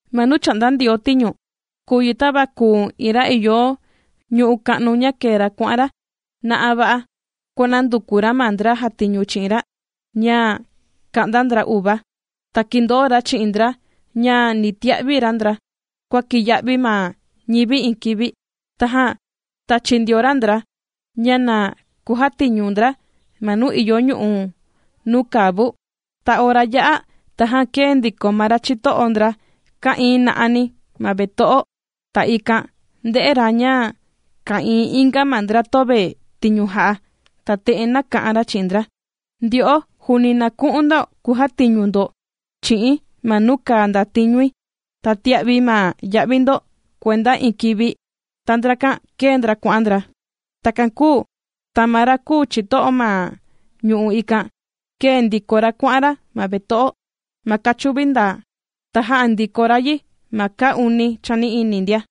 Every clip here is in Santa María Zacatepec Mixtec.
―Ma nuu chà'nda Ndioo tiñu, kùu yi tava kùu iin ra ìyo ñu'u' ka'nu, ña kēe ra kuà'an ra na'a va'a kuànanduku ra ma ndra jàtiñu chi'in ra ña ka'nda ndra uva. Ta kīndoo ra chi'in ndra ña ni tia'vi ra ndra kua kiya'vi ma ñivi iin kivi. Tajan tāchi ndio ra ndra ña na kujatiñu ndra ma nuu ìyo ñu'u' nuu kàa vu. Ta ora yā'a, tajan kēe ndiko ma ra chito'o ndra ka'íín na'ani ma veto'o, ta ikan ndē'e ra ña ka'ìin inga ma ndra töve tiñu jà'a. Ta te'en nāka'an ra chi'in ndra: “Ndyo'o juuni na ku'un ndo kujatiñu ndo chi'i̱n ma nuu kàa ndatiñui, ta tia'vi̱ ma ya'vi ndo kuenda iin kivi.” Ta ndrakan kēe ndra kuà'an ndra. Takan kūu ta ma ra kùu chito'o ma ñu'u' ikan, kēe ndiko ra kuà'an ra ma veto'o ma kachuvi ndaa. Ta jā'a ndiko ra yi ma kaa uni chani'ini ndia.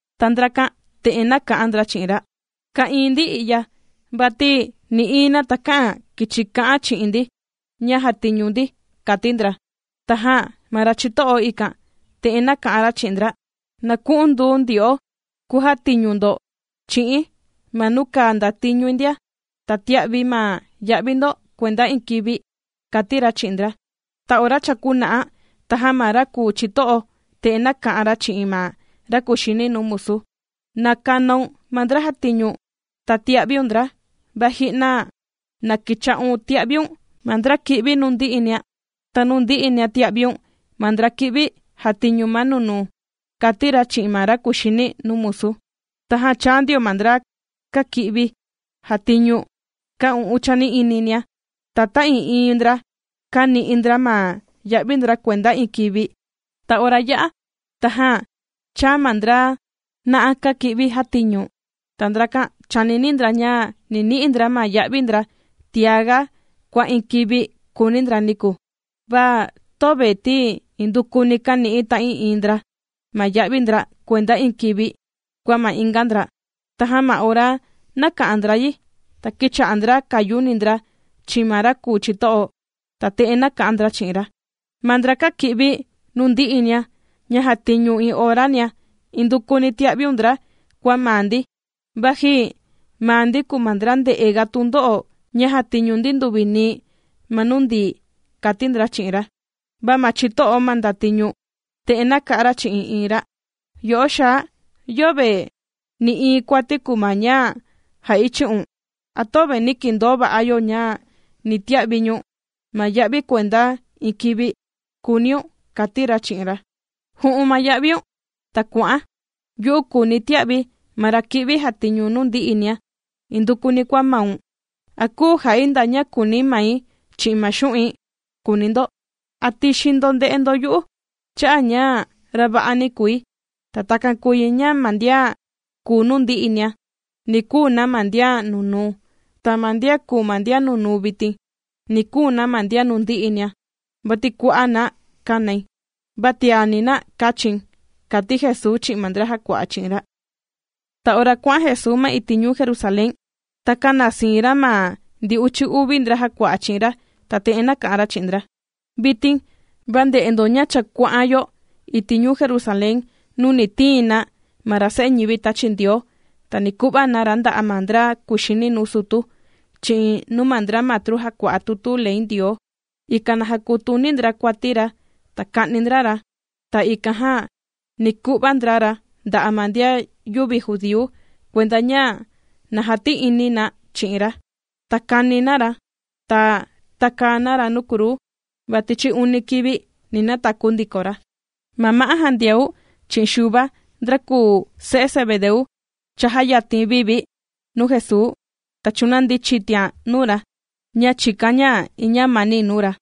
Ta ndrakan te'en nāka'an ndra chi'in ra: “Ka'ìin ndi i'ya, vati nï'iin na takä'an kìchi ka'an chi'in ndi ña jatiñu ndi”, kàti ndra. Tajan ma ra chito'o ikan, te'en nāka'an ra chi'in ndra: “Na ku'un du ndyo'o kujatiñu ndo chi'i̱n ma nuu kàa ndatiñui ndia, ta tia'vi̱ ma ya'vi ndo kuenda iin kivi”, kàti ra chi'in ndra. Ta ora cha kuna'a, tajan ma ra kùu chito'o, te'en nāka'an ra chi'in ma ra kùxini nuu musu: “Na kanaun ma ndra jàtiñu, ta tia'viun ndra, va ji'na, na kicha'un tia'viun ma ndra kī'vi nuu ndi'inia, ta nuu ndi'inia tia'viun ma ndra kī'vi jatiñu ma nunuu”, kàti ra chi'in ma ra kuxini nuu musu. Tajan chāa ndio ma ndra kāki'vi jātiñu kaa u'un chani'ininia, ta ta'ii'iin ndra kāni'i ndra ma ya'vi ndra kuenda iin kivi. Ta ora yā'a, tajan chāa ma ndra na'a kāki'vi jātiñu, ta ndrakan chānini ndra ña ni ni'i ndra ma ya'vi ndra tiaga kua iin kivi kūuni ndra niku, va töve, ti indukuni kāni'i ta'ii'iin ndra ma ya'vi ndra kuenda iin kivi, kua ma inga ndra. Tajan ma ora nāka'an ndra yi, ta kīcha'a ndra kàyuni ndra chi'in ma ra kùu chito'o, Ta te'en nāka'an ndra chi'in ra: “Ma ndra kāki'vi nuu ndi'inia, ña jātiñu iin orania, indukuni tīa'viun ndra kua maa ndi, vaji maa ndi kùu ma ndra ndē'e ga tundo'o ña jātiñu ndi nduvi nii ma nuu ndií”, kàti ndra chi'in ra. Va ma chito'o ma ndatiñu, te'en nāka'an ra chi'in iin ra: “Yo'o xaa, yöve nï'iin kuati kùu ma ña jà'i chi'un. ¿A töve nī kindoo va'a yo ña ni tia'vi̱ ñu̱n ma ya'vi kuenda iin kivi?, kùuniun”, kàti ra chi'in ra. “Ju'un ma ya'viun, ta kuà'an. Yu'u kùuni̱ tia'vi̱ ma ra kī'vi jàtiñu nuu ndi'inia, indukuni kua maun. ¿A küu jà'i nda ña kùuni mai chi'in ma xu'in?, kùuni ndo. ¿A tixin ndo nde'e ndo yu'u cha'a' ña ra va'ani kùi?” Ta takan kùu yi ña ma ndian kùu nuu ndi'inia, ni kuu na ma ndian nunuu, ta ma ndian kùu ma ndian nunuu vitin, ni kuu na ma ndian nuu ndi'inia. Vati kua'a' na kānai, va tiani na kāchi̱n ―kàti Jesuu chi'in ma ndra jàkua'a chi'in ra. Ta ora kuà'an Jesuu ma iti' ñuu Jerusalén, ta kāna siin ra ma ndi uchi uvi ndra jàkua'a chi'in ra, ta te'en nāka'an ra chi'in ndra: ―Vitin va ndè'e ndo ña cha kuà'an yo iti' ñuu Jerusalén nuu ni tiin na ma ra Se'e ñivi tāchi Ndioo, ta ni ku'va na ra nda'a' ma ndra kuxini nuu sutu, chi'in nuu ma ndra kùu matru jàkua'a tutu ley Ndioo, ikan na jakutini ndra kuati ra ta ka'ni ndra ra. Ta ikan jan ni ku'va ndra ra nda'a' ma ndian yüvi judíu, kuenda ña na jati'ini na chi'in ra, ta kàni na ra, ta tàkaa na ra nuu kruu, va tichi uni kivi ni nataku ndiko ra. Ma ma'á Jandiau chi'in Xuva ndra kùu se'e Zebedeu, chājayatin vi vi nuu Jesuu, ta chūnandi chitian nuu ra, ña chìkan ña iin ñamani nuu ra.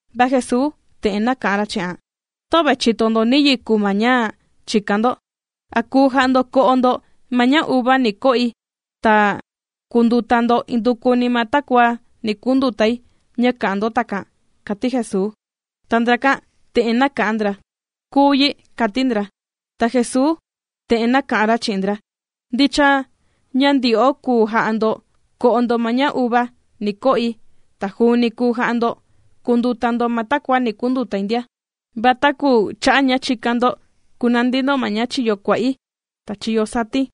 Va Jesuu te'en nāka'an ra chi'an: ―Töve chìto ndo niyi kùu ma ña chìkan ndo. ¿A kùu ja'a ndo ko'o ndo ma ña uva ni ko'i, ta kùnduta ndo indukuni ma takua ni kundutai ña kà'an ndo takan? ―kàti Jesuu. Ta ndrakan te'en nāka'an ndra: ―Kùu yi ―kàti ndra. Ta Jesuu te'en nāka'an ra chi'in ndra: ―Ndicha ña ndyo'o kùu ja'a ndo ko'o ndo ma ña uva ni ko'i, ta juuni kùu ja'a ndo kùnduta ndo ma takua ni kundutai ndia, va taku cha'a' ña chìkan ndo kunandi ndo ma chiyo kua'i, ta chiyo sati̱n,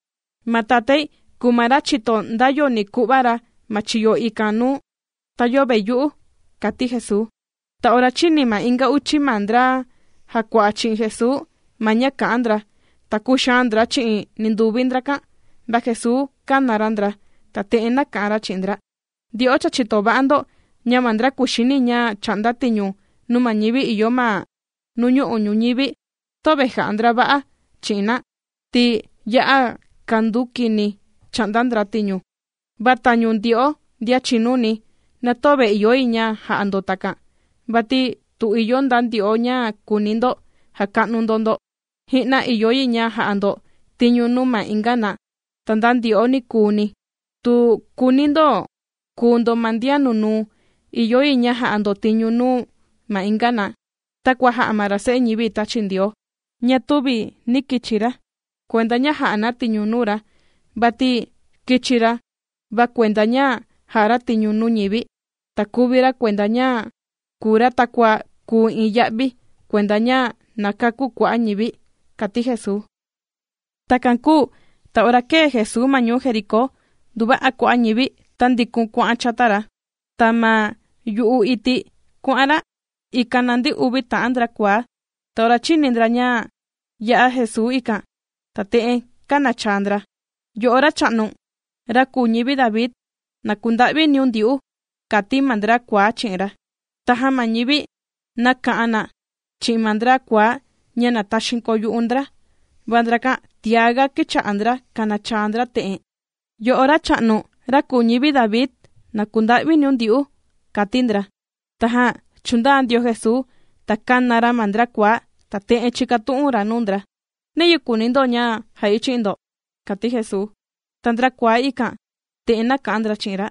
ma Tatái kùu ma ra chìto nda yo ni ku'va ra ma chiyo ikan nuu, ta yöve yu'u ―kàti Jesuu. Ta ora chīni ma inga uchi ma ndra jàkua'a chi'in Jesuu ma ña kā'an ndra, ta kūxaan ndra chi'in ninduvi ndrakan. Va Jesuu kāna ra ndra, ta te'en nāka'an ra chi'in ndra: ―Ndyo'o cha chìto va'a ndo, ña ma ndra kuxini ña chà'nda tiñu nuu ma ñivi ìyo ma nuñu'u' ñuñivi töve jà'a ndra va'a chi'in na, ti ya'a kanduu kini chà'nda ndra tiñu. Va tañu ndyo'o ndian chìnuni, na töve ìyo yi ña ja'a ndo takan, vati tu ìyo nda ndyo'o ña kùuni ndo jaka'nu ndo ndo, ji'na ìyo yi ja'a ndo tiñu nuu ma inga na. Ta nda ndyo'o nikuuni, tu kùuni ndo kuu ndo ma ndian nunuu, ìyo yi ña ja'a ndo tiñu nuu ma inga na, takua jā'a ma ra Se'e ñivi tāchi Ndioo, ña tüvi nī kichi ra kuenda ña jà'a na tiñu nuu ra, vati kīchi ra va kuenda ña jà'a ra tiñu nuu ñivi, ta kuvi ra kuenda ña kùu ra takua kùu iin ya'vi kuenda ña na kakú kua'a' ñivi ―kàti Jesuu. Takan kūu ta ora kēe Jesuu ma ñuu Jericó, nduva'a kua'a' ñivi tāndikun kuà'an chata ra. Ta ma yu'u iti' kuà'an ra, ikan nandi uvi ta'an ndra kuaá. Ta ora chīni ndra ña yà'a Jesuu ikan, ta te'en kānachaa ndra: ―¡Yo'o Racha'nu, ra kùu ñivi David, na kunda'viniun ndyu'u! ―kàti ma ndra kuaá chi'in ra. Tajan ma ñivi nāka'an na chi'in ma ndra kuaá ña na taxiin koyu'u ndra, va ndrakan tiá ga kīcha'a ndra kànachaa ndra te'en: ―¡Yo'o Racha'nu, ra kùu ñivi David, na kunda'viniun ndyu'u! ―kàti ndra. Tajan chūndaa ndio Jesuu, ta kāna ra ma ndra kuaá, ta te'en chīkatu'un ra nuu ndra: ―¿Niyi kùuni ndo ña ja'i chi'in ndo? ―kàti Jesuu. Ta ndra kuaá ikan te'en nāka'an ndra chi'in ra: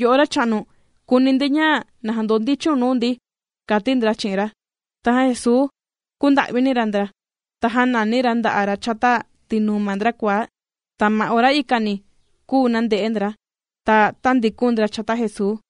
―Yo'o Racha'nu, kùuni ndi ña na jandondichiun nuu ndi ―kàti ndra chi'in ra. Tajan Jesuu kūnda'vini ra ndra, ta jānani ra nda'a' ra chata tinuu ma ndra kuaá, ta ma ora ikani kūu nande'e ndra, ta tāndikun ndra chata Jesuu.